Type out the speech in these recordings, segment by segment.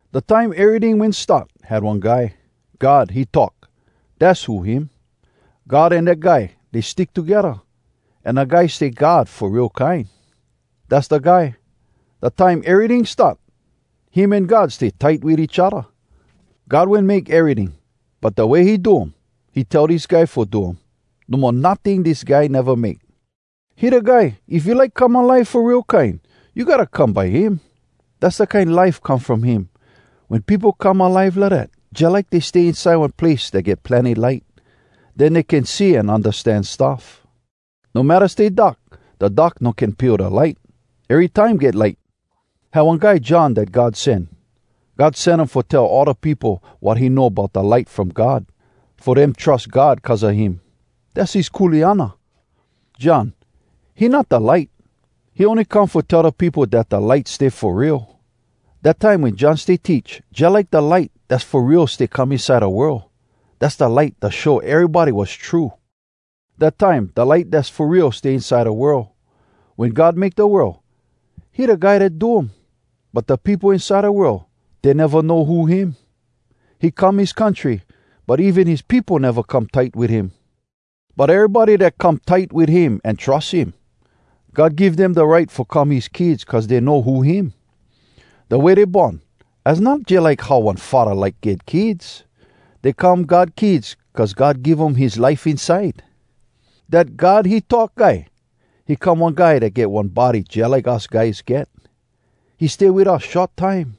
Da time eryting wen start, had one Guy. “God, He Talk,” dass who him. God an dat Guy, dey stick togedda, an da Guy stay God fo real kine. Dass da Guy, da time eryting start, him an God stay tight wit each odda. God wen make eryting, but da way he do um, he tell dis Guy fo do um. No mo notting dis Guy neva make. He da Guy, if you like come alive fo real kine, you gotta come by him. Dass da kine life come from him. Wen peopo come alive lidat, jalike dey stay inside one place dat get plenny light. Den dey can see an undastan stuff. No matta stay dark, da dark no can pio da light. Erytime get light. Had one guy John dat God sen. God sen um fo tell all da peopo wat he know bout da light from God, fo dem trus God cuz a him. Dass his kuleana. John, he not da light. He ony come fo tell da peopo dat da light stay fo real. Dat time wen John stay teach, jalike da light dass fo real stay come inside da world. Dass da light dat show erybody wass true. Dat time, da light dass fo real stay inside da world. Wen God make da world, he da Guy dat do um. But da peopo inside da world, dey neva know who him. He come his country, but even his peopo neva come tight wit him. But erybody dat come tight wit him an trus him, God give dem da right fo come his kids cuz dey know who him. Da way dey born, az not jalike how one faddah like get kids. Dey come God kids cuz God give um his life inside. Dat “God, He Talk” Guy, he come one guy dat get one body jalike us guys get. He stay wit us short time,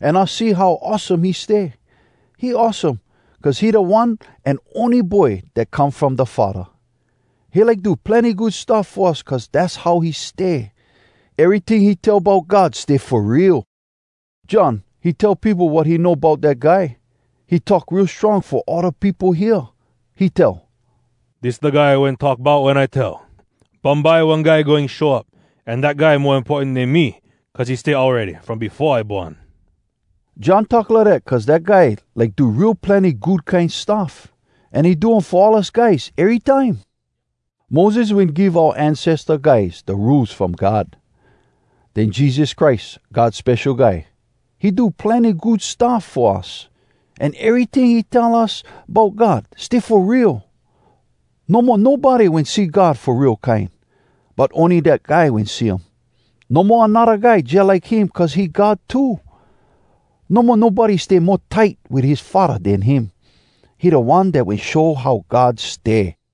an us see how awesome he stay. He awesome, cuz he da One an ony Boy dat come from da Faddah. He like do plenny good stuff fo us cuz dass how he stay. Eryting he tell bout God stay fo real. John, he tell peopo wat he know bout dat Guy. He talk real strong fo all da peopo hear. He tell, “Dis da Guy I wen talk bout wen I tell, ‘Bumbye one Guy goin show up, an dat Guy mo importan den me, cuz he stay awready from befo I born.’” John talk lidat cuz dat Guy like do real plenny good kine stuff, an he do um fo all us guys erytime. Moses wen give oua ancesta guys da Rules From God. Den Jesus Christ, God Spesho Guy, he do plenny good stuff fo us, an eryting he tell us bout God, stay fo real. No mo nobody wen see God fo real kine. But ony dat Guy wen see um. No mo anodda guy jalike him cuz he God too. No mo nobody stay mo tight wit his Faddah den him. He da One dat wen show how God stay.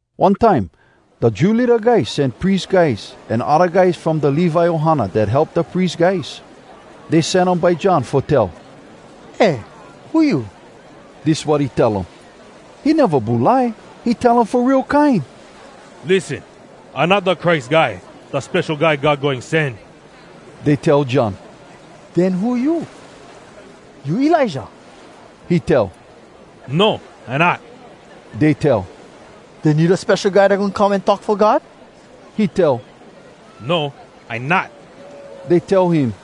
One time, da Jew leada guys sen pries guys an odda guys from da Levi ohana dat help da pries guys. Dey sen um by John fo tell, “Eh, who you?” Dis wat he tell um: He neva bulai. He tell um fo real kine, “Lissen! I not da Christ Guy, da Spesho Guy God Goin Sen.” Dey tell John, “Den who you? You Elijah?” He tell, “No, I not.” Dey tell, “Den you da Spesho Guy dat goin come an talk fo God?” He tell, “No, I not.” Dey tell him,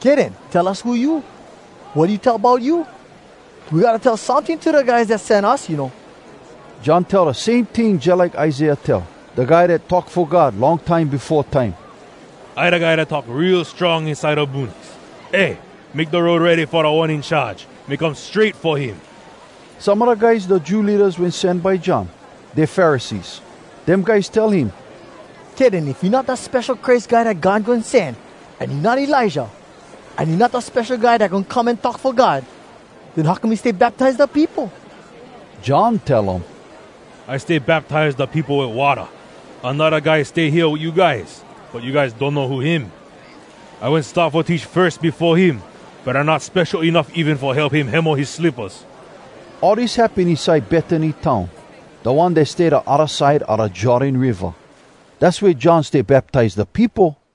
“Kay den. Tell us who you. Wat you tell bout you? We gotta tell someting to da guys dat sen us, you know!” John tell da same ting jalike Isaiah tell, da guy dat talk fo God long time befo time, “I da guy dat talk real strong inside da boonies, ‘Eh, make da road ready fo Da One In Charge. Make um strait fo him!’” Some a da guys da Jew leadas wen sen by John, dey Pharisees. Dem guys tell him, “Kay den. If you not da Spesho Christ Guy Dat God Goin Sen, an you not Elijah, an you not da Spesho Guy dat goin come an talk fo God, den how come you stay baptize da peopo?” John tell um, “I stay baptize da peopo wit watta. Anodda guy stay hea wit you guys, but you guys donno who him. I wen start fo teach firs befo him, but I not spesho enuff even fo help him hemo his slippas.” All dis happen inside Betany town, da one dat stay da odda side a da Jordan Riva. Dass wea John stay baptize da peopo.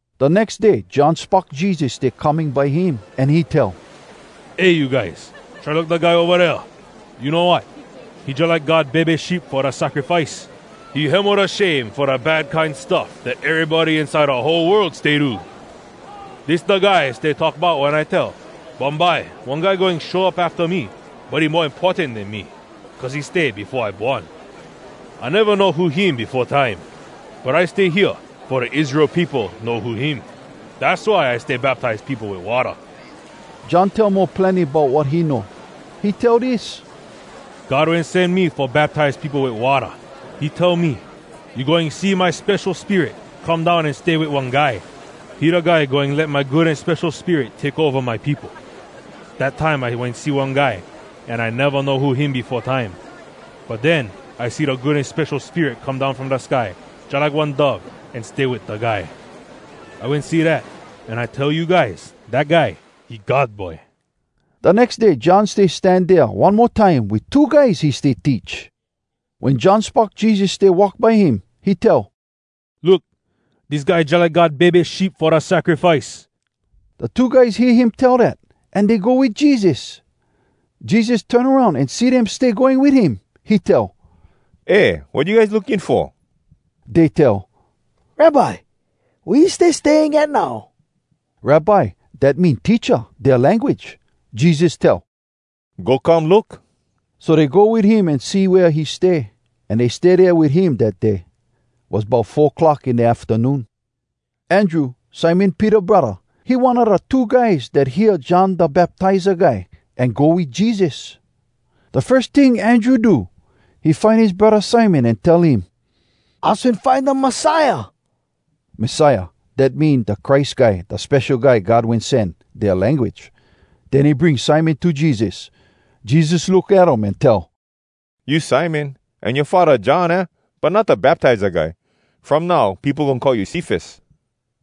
Da nex day John spock Jesus stay coming by him, an he tell, “Eh, you guys, try look da guy ova dea! You know wat? He jalike God bebe sheep fo da sacrifice. He hemo da shame fo da bad kine stuff dat erybody inside da whole world stay do! Dis da guy I stay talk bout wen I tell, ‘Bumbye one guy goin show up afta me, but he mo importan den me, cuz he stay befo I born.’ I neva know who him befo time. But I stay hea fo da Israel peopo know who him. Dass why I stay baptize peopo wit watta.” John tell mo plenny bout wat he know. He tell dis: “God wen sen me fo baptize peopo wit watta. He tell me, ‘You goin see my Spesho Spirit come down an stay wit one guy. He da guy goin let my Good An Spesho Spirit take ova my peopo.’ Dat time I wen see one guy, an I neva know who him befo time. But den I see da Good An Spesho Spirit come down from da sky jalike one dove, an stay wit da guy. “I wen see dat, an I tell you guys, dat guy, he God Boy!” Da nex day John stay stan dea one mo time wit two guys he stay teach. Wen John spock Jesus stay walk by him, he tell, “Look! Dis guy jalike God bebe sheep fo da sacrifice.” Da two guys hear him tell dat, an dey go wit Jesus. Jesus turn aroun an see dem stay going wit him. He tell, “Eh, wat you guys looking fo?” Dey tell, “Rabbi, wea you stay staying at now?” (“Rabbi,” dat mean “Teacha” dea language.) Jesus tell, “Go come look.” So dey go wit him an see wea he stay, an dey stay dea wit him dat day. Was bout four clock in da aftanoon. Andrew, Simon Peter braddah, he one a da two guys dat hear John Da Baptiza guy, an go wit Jesus. Da firs ting Andrew do, he find his braddah Simon an tell him, “Us wen find da Messiah.” (“Messiah,” dat mean “da Christ Guy, da Spesho Guy God Wen Sen,” dea language.) Den he bring Simon to Jesus. Jesus look at um an tell, “You Simon, an yoa faddah John, aah? but not da Baptiza guy. From now peopo goin call you ‘Cefas.’”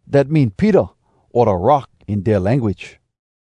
(Dat mean “Peter,” o “Da Rock,” in dea language.)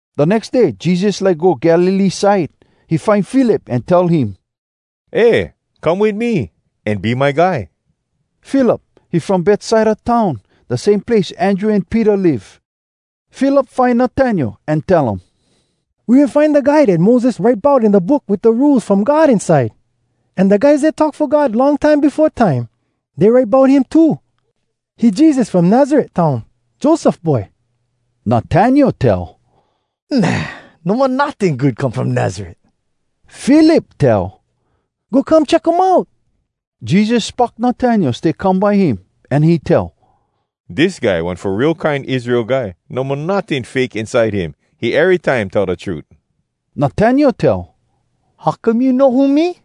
Da nex day Jesus like go Galilee side. He find Philip an tell him, “Eh, come wit me, an be my guy.” Philip, he from Betsaida town, da same place Andrew an Peter live. Philip find Natanael an tell um, “We wen find da Guy dat Moses write bout in da book wit da Rules From God inside. An da guys dat talk fo God long time befo time, dey write bout him too. He Jesus from Nazaret town, Joseph boy.” Natanael tell, “Nah! No mo notting good come from Nazaret!” Philip tell, “Go come check um out!” Jesus spock Natanael stay come by him, an he tell, “Dis guy one fo real kine Israel guy. No mo notting fake inside him! He erytime tell da trut.” Natanael tell, “How come you know who me?”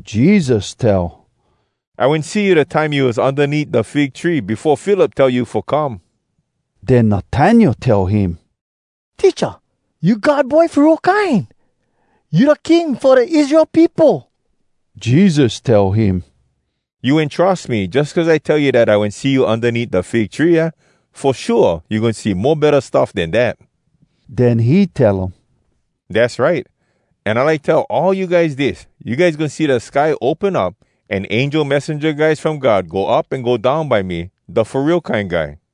Jesus tell, “I wen see you da time you was undaneat da fig tree, befo Philip tell you fo come.” Den Natanael tell him, “Teacha, you God Boy fo real kine! You da King fo da Israel peopo!” Jesus tell him, “You wen trus me jus cuz I tell you dat I wen see you undaneat da fig tree, aah?! Fo shua, you goin see mo betta stuff den dat!” Den he tell um, “Dass right! An I like tell all you guys dis: You guys goin see da sky open up, an angel messenja guys from God go up an go down by me, da Fo Real Kine Guy.”